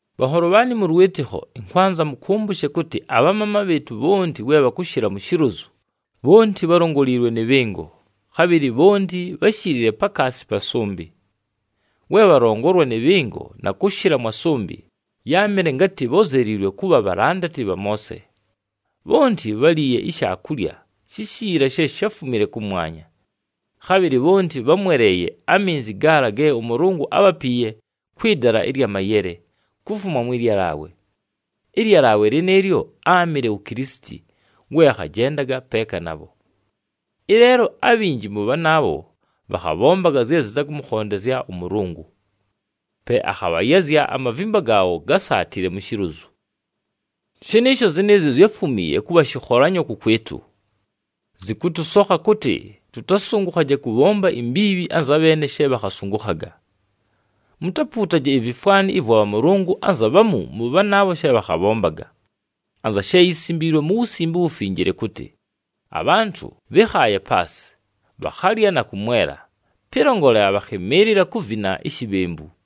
Bhanholo bhaanɨ mʉ lwɨtɨkho, ɨnkwanza mʉkʉmbʉshe kʉtɨ abhamaama bhɨɨtʉ bhonti we bhakʉshɨla mu shilozu, bhonti bhálongoliilwe nɨ bhɨngo, khabhɨlɨ bhonti bháshilile pakaasi pa sʉmbɨ. We bhalongolwa nɨ bhɨngo na kʉshɨla mwa sʉmbɨ, yáamɨle ngatɨ bhózeliilwe kʉbha bhalandati bha Moose. Bhonti bháliiye ishaakulya shishiila she sháfumile kʉmwanya. Khabhɨlɨ bhonti bhámweleeye aminzi gaala ge ʉMʉlʉngʉ ábhapiiye kwɨ dala ɨlya mayele, kufuma mwɨ lyalaawe. Ɨlyalaawe lɨnɨɨlyo áamɨle wu Kilisiti we akhajendaga peeka nabho. Ɨleelo abhinji mʉ bhanaabho, bhakhabhombaga zye zɨtakʉmʉkhondezya ʉMʉlʉngʉ. Pe akhabhayazya, amavimba gaabho gásaatile mu shilozu. Shɨnɨɨsho, zɨnɨɨzyo zyáfumiiye kʉbha shɨkholanyo kʉkwɨtʉ. Zɨkʉtʉsokha kʉtɨ tʉtasʉngʉkhaje kʉbhomba imbiibhi anza bheene she bhakhasʉngʉkhaga. Mutapuutaje ivifwani vwa bhamʉlʉngʉ anza bhamu mʉ bhanaabho she bhakhabhombaga. Anza she yisimbiilwe mu Wusimbe uWufinjile kʉtɨ, “Abhantʉ bhɨ́khaaye paasɨ, bhakhalya na kʉmwela, pɨlongolela bhakhɨmɨɨlɨla kuvina ishibhembu.”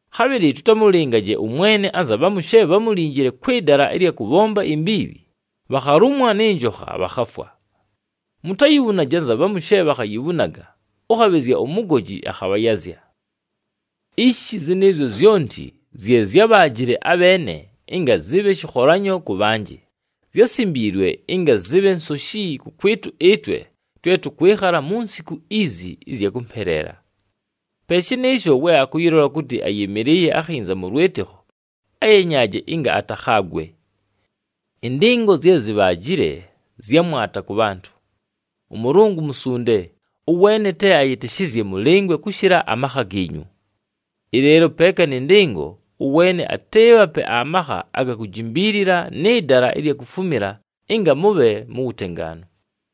Khabhɨlɨ tʉtamʉlɨngaje ʉMwene anza bhamu she bhámulinjile kwɨ dala ɨlya kʉbhomba imbiibhi, bhakhalumwa nɨ njokha, bhakhafwa. Mutayibhunaje anza bhamu she bhakhayibhunaga, ʉkhabhɨzya umugoji akhabhayazya. Ishi zɨnɨɨzyo zyonti zye zyábhaajile abheene ɨnga zɨbhe shɨkholanyo kʉ bhanjɨ, zyásimbiilwe ɨnga zɨbhe nsoshi kʉkwɨtʉ ɨtwe twe tʉkwɨkhala mu nsiku izi ɨzya kʉmpeleela. Pe shɨnɨɨsho we akʉyɨlola kʉtɨ ayɨmɨlɨɨye akhinza mʉ lwɨtɨkho, ayenyaaje ɨnga atakhaagwe. Ɨndɨngo zye zibhaajile, zya mwata kʉ bhantʉ. ɄMʉlʉngʉ musunde, ʉweene te ayɨtɨshɨzye mʉlɨngwe kʉshɨla amakha giinyu. Ɨleelo peeka nɨ ndɨngo, ʉweene atɨɨbhape amakha aga kujimbiilila nɨ dala ɨlya kufumila ɨnga mʉbhe mu wutengaanu.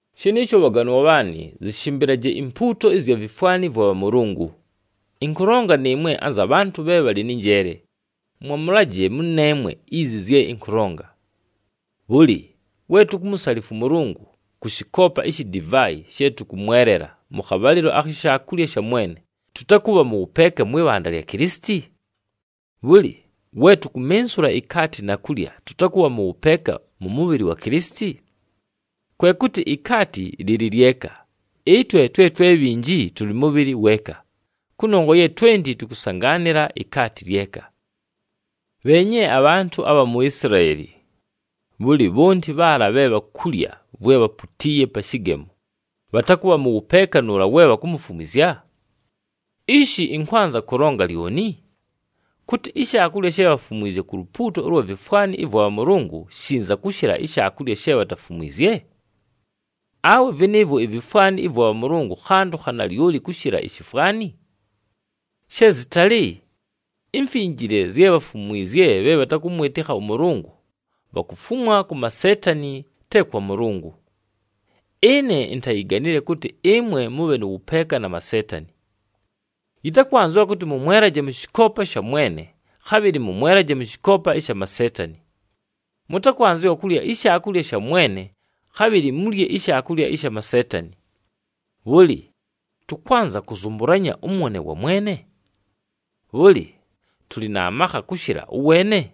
Shɨnɨɨsho bhaganwa bhaanɨ, zɨshɨmbɨlaje impuuto ɨzya vifwani vwa bhamʉlʉngʉ! Ɨnkʉlonga nɨɨmwe anza bhantʉ bhe bhalɨ nɨ njeele, mwamʉlaje mʉneemwe izi zye ɨnkʉlonga. Bhʉlɨ, we tukumusalifwa ʉMʉlʉngʉ kʉ shɨkoopa ishi divaayi she tʉkʉmwelela mʉ khabhalɨlo akhi Shaakulya sha Mwene, tʉtakʉbha mʉ wʉpeeka mwɨ bhanda lya Kilisiti? Bhʉlɨ, we tukumensula ikaati na kulya, tʉtakʉbha mʉ wʉpeeka mʉ mʉbhɨlɨ wa Kilisiti? Kwe kʉtɨ ikaati lɨlɨ lyeka, ɨtwe twe twe bhinji, tʉlɨ mʉbhɨlɨ weeka, kʉnongwa ye twenti tʉkʉsangaanɨla ikaati lyeka. Bheenye abhantʉ abha mu Isilaeli. Bhʉlɨ, bhonti bhaala bhe bhakulya vwe bhaputiiye pa shɨgemo, bhatakʉbha mʉ wʉpeeka nʉʉla we bhakumufumwizya? Ishi ɨnkwanza kʉlonga lyoni? Kʉtɨ, ishaakulya she bhafumwizye ku lupuuto ʉlwa vifwani ɨvwa bhamʉlʉngʉ shinza kʉshɨla ishaakulya she bhatafumwizye? Awe vɨnɨɨvwo ivifwani ɨvwa bhamʉlʉngʉ khantʉ kha nalyoli kʉshɨla ishifwani? She zɨtalɨ! Imfinjile zye bhafumwizye bhe bhatakʉmwɨtɨkha ʉMʉlʉngʉ, bhakufumwa ku maseetani te kwa Mʉlʉngʉ. Ɨne intayiganile kʉtɨ ɨmwe mʉbhe nʉ wʉpeeka na maseetani. Yɨtakwanzɨwa kʉtɨ mʉmwelaje mʉ shɨkoopa sha Mwene, khabhɨlɨ mʉmwelaje mʉ shɨkoopa ɨsha maseetani. Mʉtakwanzɨwa kulya iShaakulya sha Mwene, khabhɨlɨ mulye ishaakulya ɨsha maseetani. Bhʉlɨ, tʉkwanza kʉzʉmbʉlanya ʉmwone wa Mwene? Bhʉlɨ tʉlɨ na makha kʉshɨla ʉweene?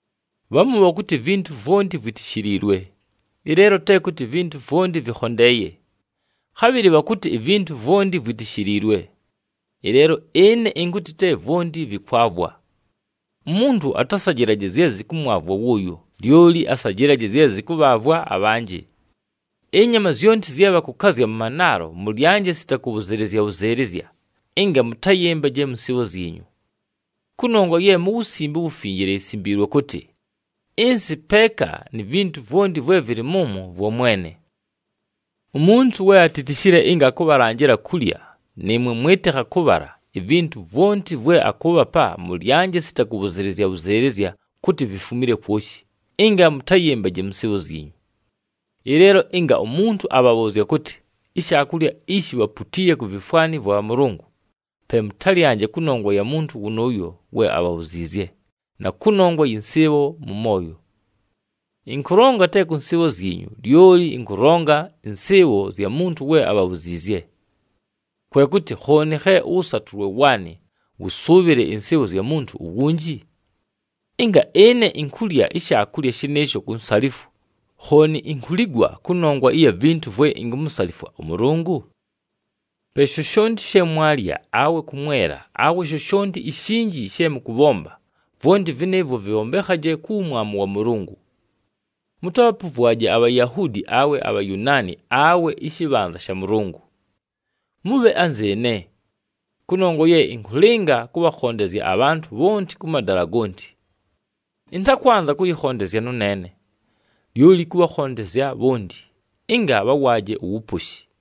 Bhamu bhakʉtɨ, “Ivintu vwonti vwitishiliilwe.” Ɨleelo te kʉtɨ ivintu vwonti vɨkhondeeye. Khabhɨlɨ bhakʉtɨ, “Ivintu vwonti vwitishiliilwe.” Ɨleelo ɨne ɨnkʉtɨ, te vwonti vɨkwavwa. Umuntu atasajɨlaje zye zɨkʉmwavwa wʉʉyo, lyoli asajɨlaje zye zɨkʉbhaavwa abhanjɨ. Ɨnyama zyonti zye bhakʉkazya mʉ manaalo mʉlyanje sita kʉbhʉzɨɨlɨzya-bhʉzɨɨlɨzya, ɨnga mʉtayɨmbaje mʉ nsɨɨbho zyinyu. Kʉnongwa ye mu Wusimbe uWufinjile yisimbiilwe kʉtɨ, “Ɨnsɨ peeka ni vintu vwonti vwe vɨlɨ mʉmwo, vwa Mwene.” Umuntu we atitishile ɨnga akʉbhalanjɨla kulya, nɨɨmwe mwɨtɨkha kʉbhala, ivintu vwonti vwe akʉʉbhapa, mʉlyanje sita kʉbhʉzɨɨlɨzya-bhʉzɨɨlɨzya kʉtɨ vifumile kwoshi, ɨnga mʉtayɨmbaje mʉ nsɨɨbho zyinyu. Ɨleelo ɨnga umuntu abhabhʉʉzya kʉtɨ, “Ishaakulya ishi bhaputiiye ku vifwani vwa bhamʉlʉngʉ,” pe mʉtalyanje kʉnongwa ya muntu wʉnʉʉyo we abhabhuziizye, na kʉnongwa yɨ nsɨɨbho mʉ mooyo. Ɨnkʉlonga te kʉ nsɨɨbho zyinyu, lyoli ɨnkʉlonga ɨnsɨɨbho zya muntu we abhabhuziizye. Kwe kʉtɨ, khooni khe ʉwʉsatʉlwe waanɨ wʉsʉʉbhɨle ɨnsɨɨbho zya muntu uwunji? Ɨnga ɨne inkulya ishaakulya shɨnɨɨsho ku nsalifwo, khooni inkuligwa kʉnongwa ɨya vintu vwe inkumusalifwa ʉMʉlʉngʉ? Pe shoshonti she mwalya, awe kʉmwela, awe shoshonti ishinji she mʉkʉbhomba, vwonti vɨnɨɨvwo vɨbhombekhaje ku wumwamu wa Mʉlʉngʉ. Mʉtabhapʉvwaje aBhayahuudi awe aBhayunaani awe ɨshɨbhanza sha Mʉlʉngʉ. Mʉbhe anzɨɨne. Kʉnongwa ye ɨnkʉlɨnga kʉbhakhondezya abhantʉ bhonti kʉ madala gonti. Ɨntakwanza kʉyɨkhondezya nʉneene, lyoli kʉbhakhondezya bhonti, ɨnga bhawaaje uwuposhi.